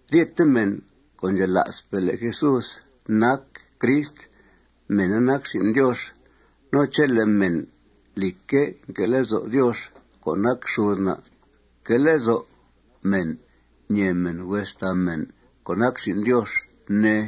Ryete mèn co' ndxela'spe' le' Jesús nac Crist, mèna nac xin' Diox. No chele' mèn, lìcque', nque' lezo' Diox co' nac xud na', que' lezo' mèn ñèe mèn hues xtàa mèn co' nac xin' Diox, ne.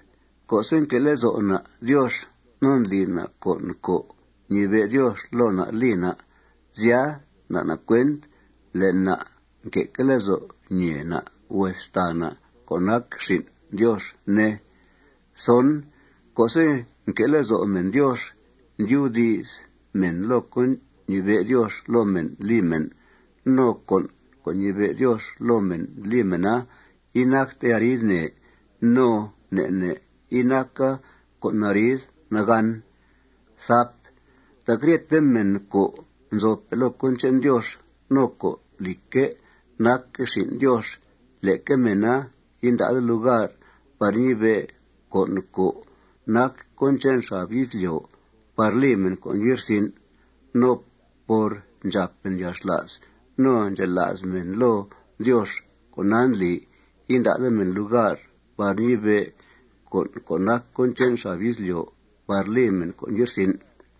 Co'se' nque' lezo' na' Diox no ndli na' con' co' ñibe' Diox loo na' li na', sya, nda' na' cuent le' na' nque'que' lezo' ñèe na' hues xtàa na' co' nac xin' Diox, ne. Co'se' nque' lezo' mèn Diox, ndyubdi's mèn loo con' ñibe' Diox loo mèn li mèn. No con' co' ñibe' Diox loo mèn li mèna inacta arid nè no ne' ne' inaca con' arid nagàn. Tac ryete mèn co' nzope' loo cón che'n Diox no co', lìcque', nac xin' Diox, leque mèna inda'de lugar par ñibe' con' co' nac cón che'n xab izlyo' par li mèn con' ye'rsin'. No por ndxàp mèn yalxla's no ndxela's mèn loo Diox con'a ndli inda'de mèn lugar par ñibe' con' co' nac cón che'n xab izlyo' par li mèn con' ye'rsin'.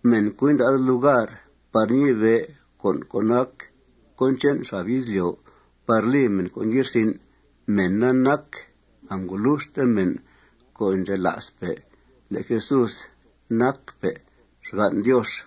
Mèn co' inda'de lugar par ñibe' con' co' nac cón che'n xab izlyo' par li mèn con' ye'rsin', mèna nac angoluxte mèn co' ndxela'spe' le' Jesús nacpe' xgan' Diox.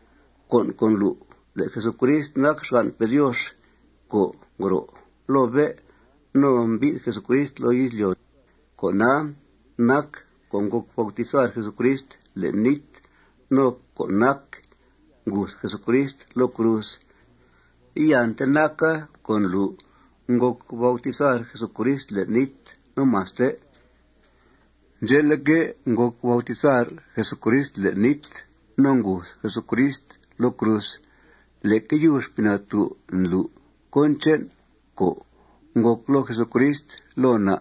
Con' co' ndlu' le' Jesucrist nac xgan'pe' Diox co' ngro' loo bé' no mbi'th Jesucrist loo izlyo', con'a nac co' ngòc bautizar Jesucrist le'n nít no co' nac nguth Jesucrist loo cruz. Iante naca co' ndlu' ngòc bautizar Jesucrist le'n nít no maste. Ndxe'leque', ngòc bautizar Jesucrist le'n nít no nguth Jesucrist loo cruz. Leque yub Xpii Natú' ndlu' cón che'n co' ngòc loo Jesucrist loo na'.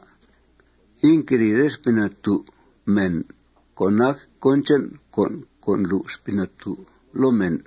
Inquedìide Xpii Natú' mèn co' nac cón che'n con' co' ndlu' Xpii Natú' loo mèn.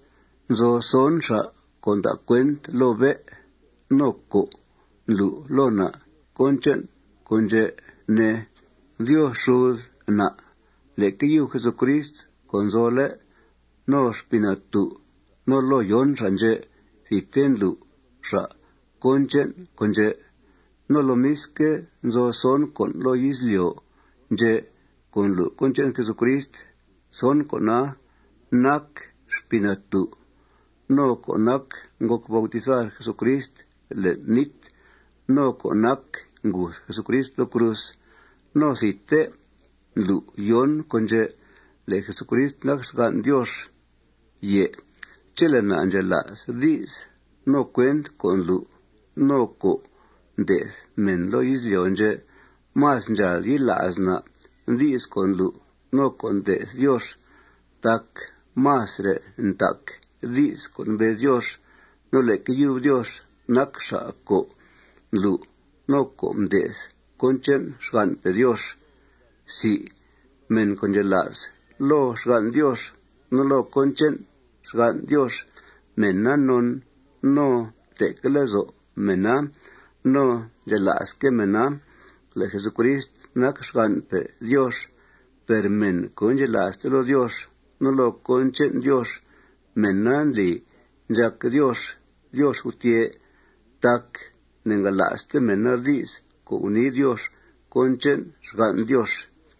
Nzo son xa' co' nda' cuent loo bé' no co' ndlu' loo na' cón che'n con' ndxè', ne: Diox xud na', leque yub Jesucrist co' nzole', no Xpii Natú'. No loo yon xa' ndxè', thidte ndlu' xa' cón che'n con' ndxè'. No lomisque', nzo son con' loo izlyo' ndxè' co' ndlu' cón che'n Jesucrist. Son con'a nac Xpii Natú', no co' nac ngòc bautizar Jesucrist le'n nít, no co' nac nguth Jesucrist loo cruz. No thidte ndlu' yon con' ndxè' le' Jesucrist nac xgan' Diox. Chele' na' ndxela's di's no cuent co' ndlu' no co' nde'th mèn loo izlyo' ndxè', más ndxàal yila's na' di's co' ndlu' no co' nde'th Diox tac masre' ntac di's co' mbez Diox. No leque yub Diox nac xa' co' mblu' no co' mde'th cón che'n xgan'pe' Diox. Mèn co' ndxela's loo xgan' Diox no loo cón che'n xgan' Diox, mèna non no nte'que' lezo' mèna no ndxela'sque' mèna le' Jesucrist nac xgan'pe' Diox. Per mèn co' indxela'ste loo Diox no loo cón che'n Diox, mèna ndli ndxàc Diox Diox gutyè' tac ne'ngala'ste mèna di's co' gunii Diox cón che'n xgan' Diox.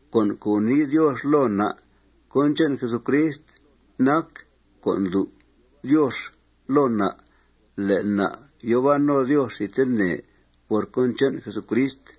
Con' co' gunii Diox loo na' cón che'n Jesucrist nac co' ndlu' Diox loo na' le' na' yòo ban no Diox thidtene por cón che'n Jesucrist.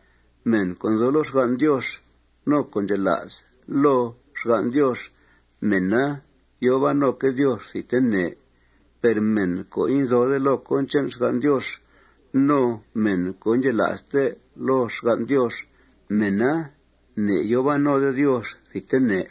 Mèn co' nzo loo xgan' Diox no co' ndxela's loo xgan' Diox, mèna yòo ban noque' Diox thidtene. Per mèn co' inzode loo cón che'n xgan' Diox no mèn co' indxela'ste loo xgan' Diox, mèna ne'yòo ban node Diox thidtene.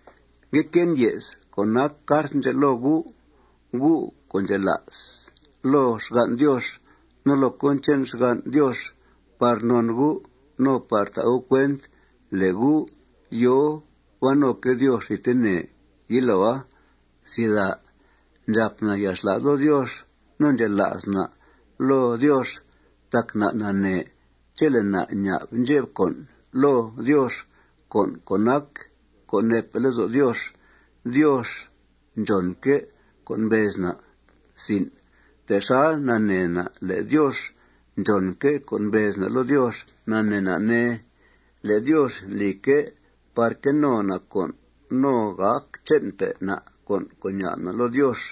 Ngue que'en ye's co' nac cart ndxè' loo gu', gu' co' ndxela's loo xgan' Diox no loo cón che'n xgan' Diox, par non gu' no par ta' gu' cuent le' gu' yòo ban noque' Diox thidtene yiloa. Ndxàp na' yalxla's loo Diox no ndxela's na' loo Diox tac na' nanee chele' na' ña'b ndxep con' loo Diox, con' co' nac co' neepe' lezo' Diox, Diox ndxònque' co' mbez na'. Texal nanee na' le' Diox ndxònque' co' mbez na' loo Diox, nanee na', ne, le' Diox ndlique' par que no na' con' no gàc che'npe' na' con' co' ña'b na' loo Diox.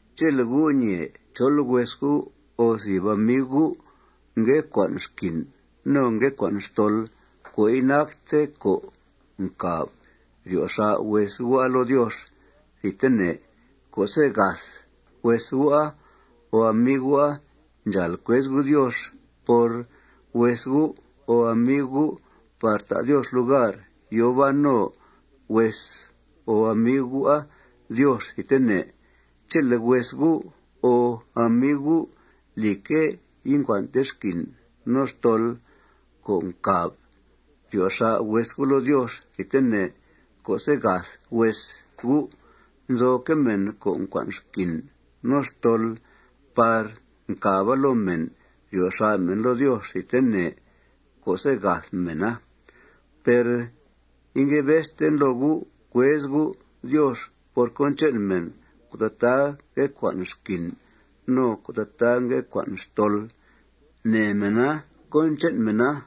Chele' gu' ñèe chol hues gu' o thìb amiu gu' ngue cua'n xquin no ngue cua'n xtol co' inacte co' ncàb ryo xà' hues gu'a loo Diox thidtene co'se' gath hues gu'a o amiu gu', ndxàal cuez gu' Diox por hues gu' o amiu gu' par ta' Diox lugar yòo ban no hues o amiu gu'a Diox thidtene, chele' hues gu' o amiu gu', lìcque', incua'nte xquin no xtol co' ncàb ryo xà' hues gu' loo Diox thidtene co'se' gath hues gu'. Nzoque' mèn co' ncua'n xquin no xtol par ncàba loo mèna ryo xà' mèna loo Diox thidtene co'se' gath mèna. Per ingue bezten loo gu' cuez gu' Diox por cón che'n mèn co' tataa ngue cua'n xquin no co' tataa ngue cua'n xtol. Nee mèna cón che'n mèna.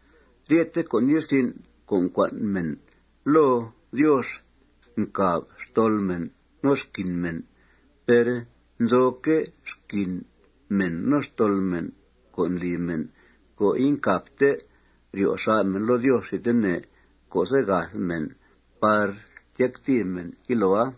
Ryethe con' ye'rsin' co' ncua'n mèn loo Diox ncàb xtol mèn no xquin mèn. Per nzoque' xquin mèn no xtol mèn co' ndli mèn co' incàbte ryo xà' mèn loo Diox thidtene co'se' gath mèn par tyactìi mèn yiloa.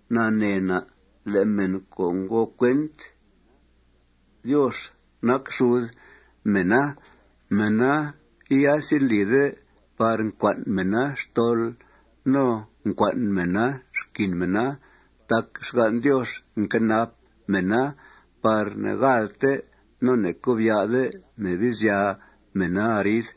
Nanee na' le' mèn co' ngo cuent Diox nac xud mèna, mèna iasendlide par ncua'n mèna xtol no ncua'n mèna xquin mèna tac xgan' Diox nquenap mèna par ne'gaàlte no ne'cobya'de Mebizya mèna arid.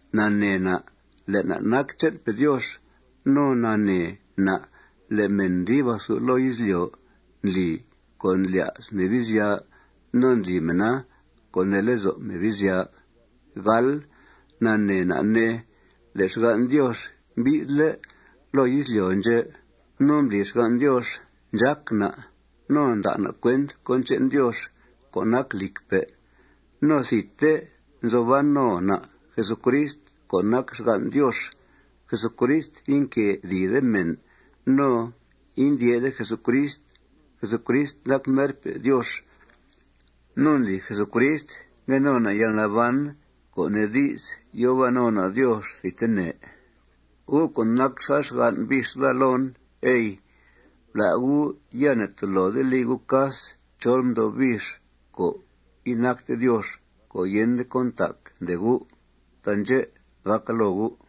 Nanee na' le' na' nac che'npe' Diox. No nanee na' le' mèn dib athu loo izlyo' ndli co' ndlya's Mebizya no ndli mèna co' nee lezo' Mebizya. Nanee na', ne, le' xgan' Diox mbi'thle' loo izlyo' ndxè'. No mbli xgan' Diox ndxác na' no nda' na' cuent cón che'n Diox co' nac lìcpe'. No thidte nzo ban no na' Jesucrist co' nac xgan' Diox. Jesucrist inquedìide mèn no indyè'de Jesucrist. Jesucrist nac merpe' Diox. No ndli Jesucrist ngue no na' yalnaban, co' nee di's, yòo ban no na' Diox thidtene. Gu' co' nac xal xgan' bix daa loon, ey, blá' gu'. Ya ne'tolode li gu' cas chol mdo' bix co' inacte Diox, co' yende cón ntac, ndee gu'. Taandxè' gàca loo gu'.